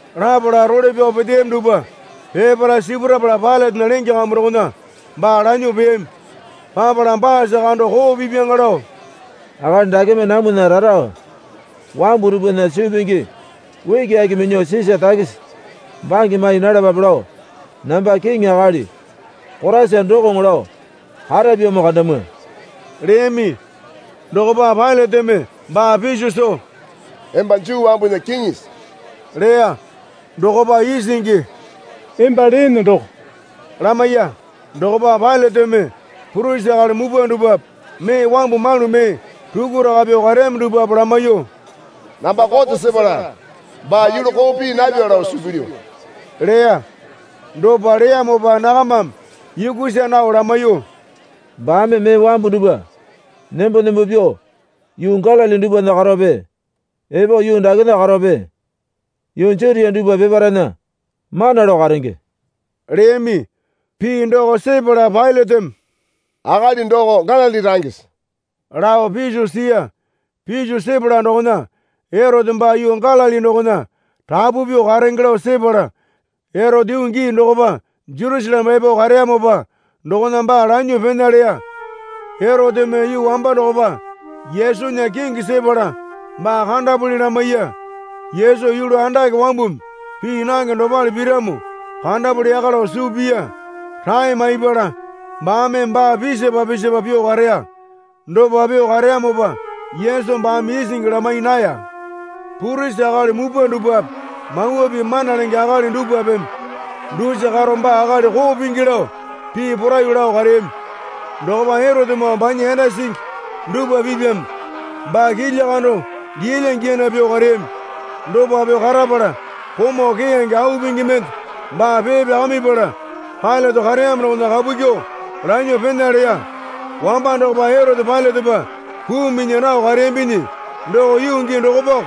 Lapala role pyao peteyami dupwa peparae sipurapala Pailatena lenge kambu dokona baa lanyuo peyami. Papala baasa kando koo pipyaŋa lao, Akali dakeme namwana rara wambu dupwana suu pingi ukiaki minyuo Sisa takisi bange mai nalapape lao namba kiŋi akali Koraisa dokoŋo lao karapyamo kandamwa leyami. Dokopa Pailateme baa piso soo, Emba Juu wambunya kiŋisi? leya. Dokopa isingi, Emba leene doko lamaiya. Dokopa Pailateme purisi akali mupwa dupwape mee wambu malu mee rukuraka pyuo kareyami dupwape lamaiyuo, Namba kote sepala baa yulu koo pii napya lao suu pilyu leya. Dopa leyamopa nakamame yukusa nao lamaiyuo, Baame mee wambu dupwa nembo nembo pyuo yuu Galili dupwana karowape epo yuu dakena karowape yuu Jutia dupwa peparaena mana lao karenge leyami. Pii doko sepala Pailateme, Akali doko Galili rangese? lao piso siya. Piso sepala dokona Erote baa yuu Galili dokona rapu pyuo karenge lao sepala Erote yuu gii dokopa Jerusaleme epo kareyamopa dokona baa lanyuo pena leya. Eroteme yuu wamba dokopa Yesunya kingi sepala baa kandapuli lamaiya. Yesu yulu andake wambumi pii nange dopale piramo kandapuli yaka lao suu piya. Rae maipala baame baa pisapa pisapa pyuo kareya. Dopa pyuo kareyamopa Yesu baame isingi lamai naya. Purisi akali mupwa dupwape Mawa Pii mana lenge akali dupwapeme dusa karo baa akali koo pingi lao pii poraiyuo lao kareyami. Dokopa Erotemoo banya yanda singi dupwa pipyame baa kilya kando giyalya giyana pyuo kareyami. Dopa pyuo karapala komau keyange au pingi mende baa pee pyakamipala Pailate kareyamo dokona kapu kyuo lanyuo pena leya. Wamba dokopa Erote Pailatepa puu minya nao kareyambinyi doko yuu gii dokopako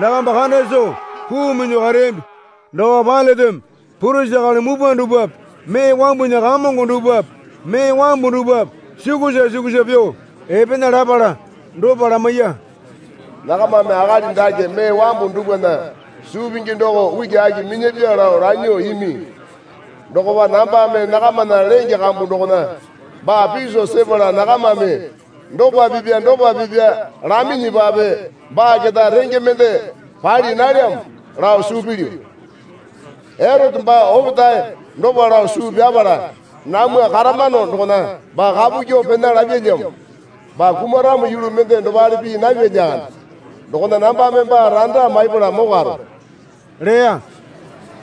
nakamba kanda soo puu miyuo kareyambi. Dokopa Pailateme purisi akali mupwa dupwape mee wambunya kamongo dupwape mee wambu dupwape sukusa sukusa pyuo epena lapala dopa lamaiya. Nakamame akali dake mee wambu dupwana suu pingi doko ukiaki minyapya lao lanyuo imi. Dokopa nambame nakamana lenge kambu dokona baa piso sepala nakamame dopa pipya dopa pipya laminyipape baa keta renge mende pali nalyamo lao suu pilyu. Erote baa opetae dopa lao suu pyapala namwa karamano dokona baa kapu kyuo pena lapyalyamo. Baa kumaramo yulu mende dopale pii napya lyakande. Dokona nambame baa randa maipala mokwaro, leya.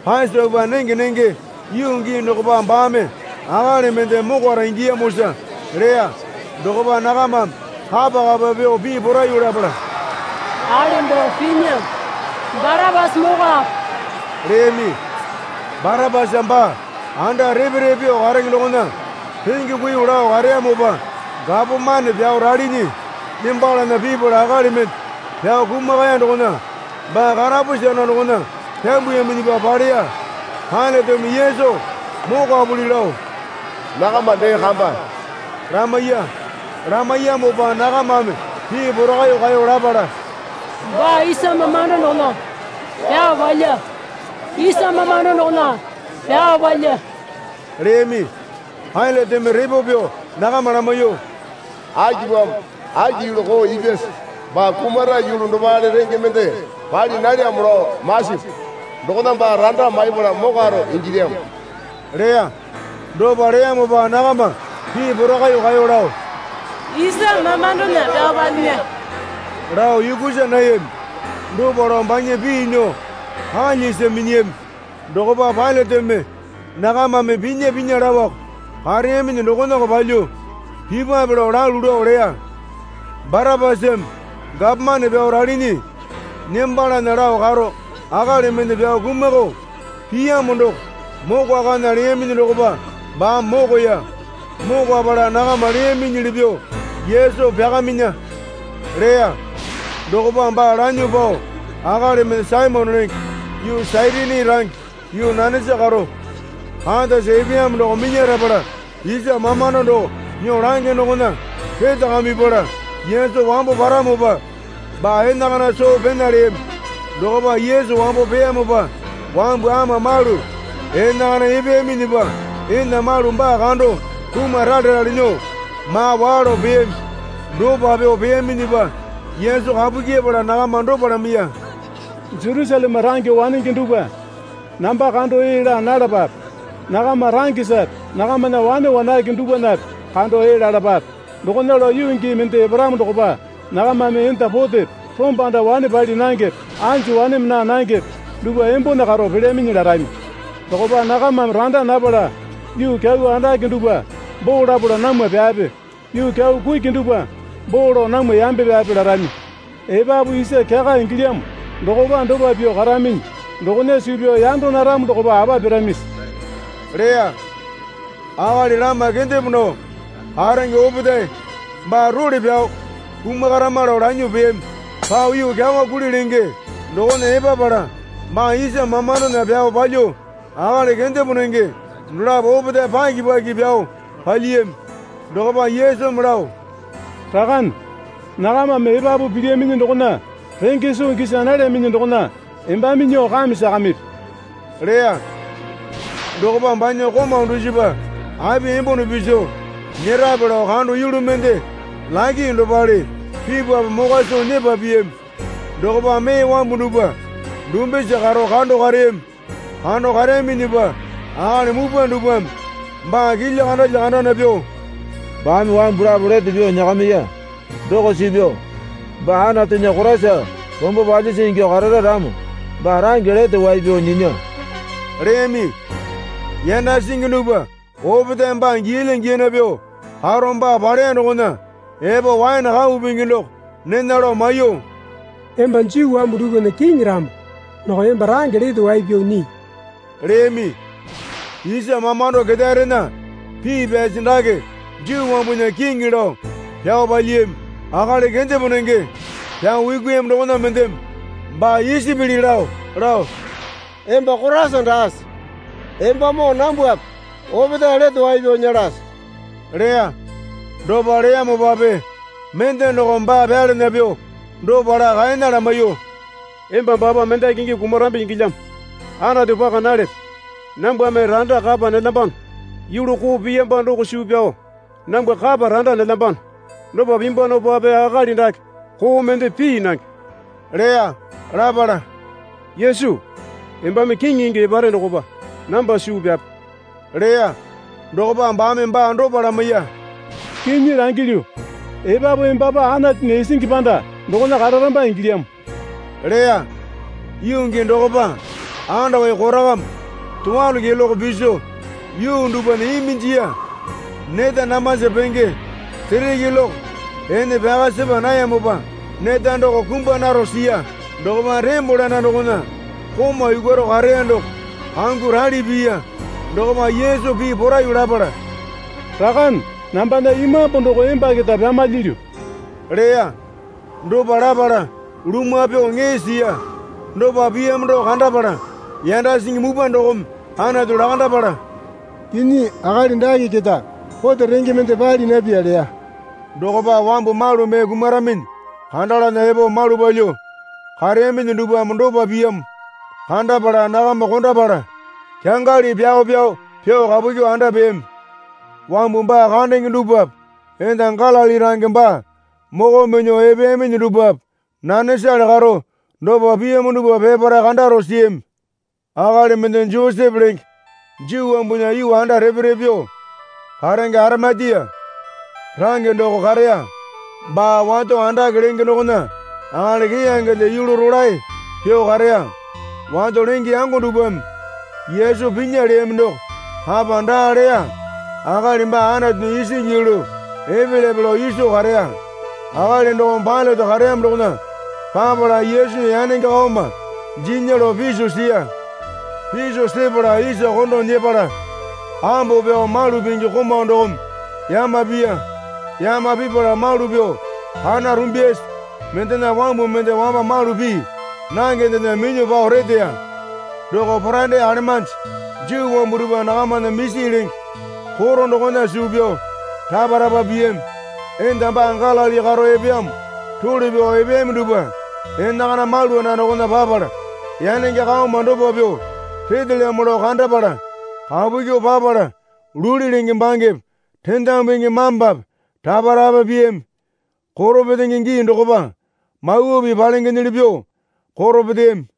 (Pasopa nenge nenge yuu gii dokopa baame akali mende mokwara ingiyamosa leya.) Dokopa nakamame kapa kapa pyuo pii poraiyuo lapala, Akali doko pinya, Barapasa mokwape leyami. (Barapasa baa anda repe repe pyuo karenge dokona renge kuiyuo lao kareyamopa gapomane pyao ralinyi nembalana pipala akali mende pyao kumakaya dokona baa karapusi anda dokona pambuyaminyipa paleya.) Pailateme Yesu mokwapuli lao nakama dee kamba lamaiya. Lamaiyamopa nakamame pii porakaiyuo kaeyo lapala, Baa isa mamando dokona pyao palya, isa mamando dokona pyao palya leyami. Pailateme repo pyuo nakama lamaiyuo, Akipamo, aki yulu koo ipyase? Baa kumara yulu dopale renge mende pali nalyamo lao masapu. Dokona baa randa maipala mokwaro ingilyamo leya. Dopa leyamopa nakama pii porakaiyuo kaeyo lao, isa mamandona pyao palyinya, lao yukusa nayami. Dopa lao banya pii nyuo kalyasi minyiyami. Dokopa Pailateme nakamame pinya pinya laoko kareyaminyi dokonako palyuo pipwape lao lalu lao leya. Barapasame gapomane pyao ralinyi nembalana lao karo akali mende pyao kumakao piyamo doko mokwakana leyaminyi dokopa baame mokoya. Mokwapala nakama leyaminyili pyuo Yesu pyakaminya leya. Dokopa baa lanyuo pao akali mende Saimone lenge yuu Sairini range yuu nanesa karo katasa epeyamo doko minyarapala isa mamando doko nyuo lange dokona retakamipala Yesu wambo paramopa baa enakana soo Pena leyami. Dokopa Yesu wambo peyamopa wambu ama malu enakana epeyaminyipa enda malu baa kando kumaralerale nyuo maa waa lao peyami. Dopa pyuo peyaminyipa Yesu kapu kyepala nakama dopa lamaiya. Jerusaleme range wanenge dupwa, namba kando ee laa nalapape. Nakama rangesape nakamana wane wanake dupwanape kando ee lalapape. Dokona lao yuu gii mende eparamo dokopa nakamame enda potepe rombanda wane pali nangepe anju waneme naa nangepe dupwa embone karo pelyaminyi larami. Dokopa nakamame randa napala, yuu kyau andake dupwa boo lapala namwa pyape, yuu kyau kuki dupwa boo lao namwa yambe pyape, larami. Epapu isa kyaka ingilyamo dokopa dopa pyuo karaminyi dokona suu pyao yanda naramo dokopa apa piramisi? leya. Akali lama kendepo nao karenge opetae baa role pyao kumakarama lao lanyuo peyami. Pao yuu Kyawa Kuli lenge dokona epapala baa isa mamandona pyao palyuo akali kendepo nenge dolapo opetae paki paki pyao palyiyami. Dokopa Yesumi lao, Rakane, nakamame epapu pilyaminyi dokona renge soo gisa nalyaminyi dokona embame nyuo kame sakamipi leya. Dokopa banya komau dusipa api embone piso nyerape lao kando yulu mende lake dopale pipapu mokwa soo nyepa piyami. Dokopa mee wambu dupwa dumbisa karo kando kareyami. Kando kareyaminyipa akali mupwa dupwame baa kilya kandalya kandana pyuo, Baame wambu lapo lete pyuo nyakamiya doko suu pyao baa Anatunya Koraisa rombo palyisi ingyuo karara ramo baa range lete wai pyao nyinya, leyami. Yanda singi dupwa opetaeme baa giyalya giyana pyuo karo baa paleya dokona epo waene kau pingi doko nena lao maiyuo, Emba Juu wambu dupwana Kiŋi ramo doko emba range lete wai pyao nyii, leyami. Isa mamando ketaerena pii pyasi, Dake Juu wambunya Kiŋi, lao pyao palyiyami. Akali kendepo nenge pyao yukuyami dokona mendeme baa isi pili lao lao, Emba Koraisa daase? Embamoo nambwape opetae lete pyuo nyelase, leya. Dopa leyamopape mende dokome baa pyalana pyuo dopa laa kaena lamaiyuo, Emba baapa mendaki ingyuo kumarambi ingilyamo. Anatu paka nalepe? Nambwame randa kapa nelyambano. Yulu koo piyamba doko suu pyao nambwa kapa randa nelyambano. Dopa pimbwanopape akali dake koo mende pii nange leya. Lapala, Yesu, embame kiŋi ingyuo epare dokopa namba suu pyape leya. Dokopa baame baa dopa lamaiya. Kinyi langilyu, epapu embapa Anatunya isingi panda dokona kararamba ingilyamo leya. Yuu gii dokopa andawai korakama towalo keloke piso yuu dupwana iminjiya. Neta damasa penge sere keloke ene pyaka sepa nayamopa neta doko kumbwa naro siya. Dokopa tembole anda dokona komau yukwaro kareya doko kanguo rali piya. Dokopa Yesu pii poraiyuo lapala, Rakane nambana imambu doko emba keta pyamalyilyu, leya. Dopa lapala lumwa pyuo ŋee siya. Dopa piyamo doko kandapala yanda singi mupwa dokome Anatu lakandapala, Kinyi akali dake keta kote renge mende pali napya leya. Dokopa wambu malu mee kumaraminyi kandalana epo malu palyuo kareyaminyi dupwame dopa piyamo kandapala nakama kondapala kyangali pyao pyao pyuo kapu kyuo anda peyami. Wambu baa kandenge dupwape enda Galili range baa moko minyuo epeyaminyi dupwape nanesale karo dopa piyamo dupwa peparae kandaro siyami. Akali mende Josepe lenge Juu wambunya yuu anda repe repe pyuo karenge Arimatia range doko kareya. Baa wato andake lenge dokona akali keyangende yulu rolae pyuo kareya. Wato lenge yango dupwame Yesu pinya leyami doko kapa daa leya akali baa Anatunya isingi yulu epelyape lao iso kareya. Akali dokome Pailate kareyamo dokona papala Yesunya yanenge kaoma jinya lao piso siya. Piso sepala isa kondo nyepala ambo pyao malu pingi komau dokome yama piya. Yama pipala malu pyuo kana rumbyasi mendena wambu mende wamba malu pii nangendena minyuo pao reteya. Doko Poraende alemanji Juu wambu dupwa nakamana misi lenge koto dokona suu pyao rapa rapa piyami. Enda baa Galili karo epeyamo role pyao epeyami dupwa enakana malu anda dokona papala yanenge kaoma dopa pyuo retelyamo lao kandapala kapu kyuo papala luli lenge bangepe rendamu pingi mambape rapa rapa piyami. Koro petenge gii dokopa Mawa Pii palengenyili pyuo koro peteyami.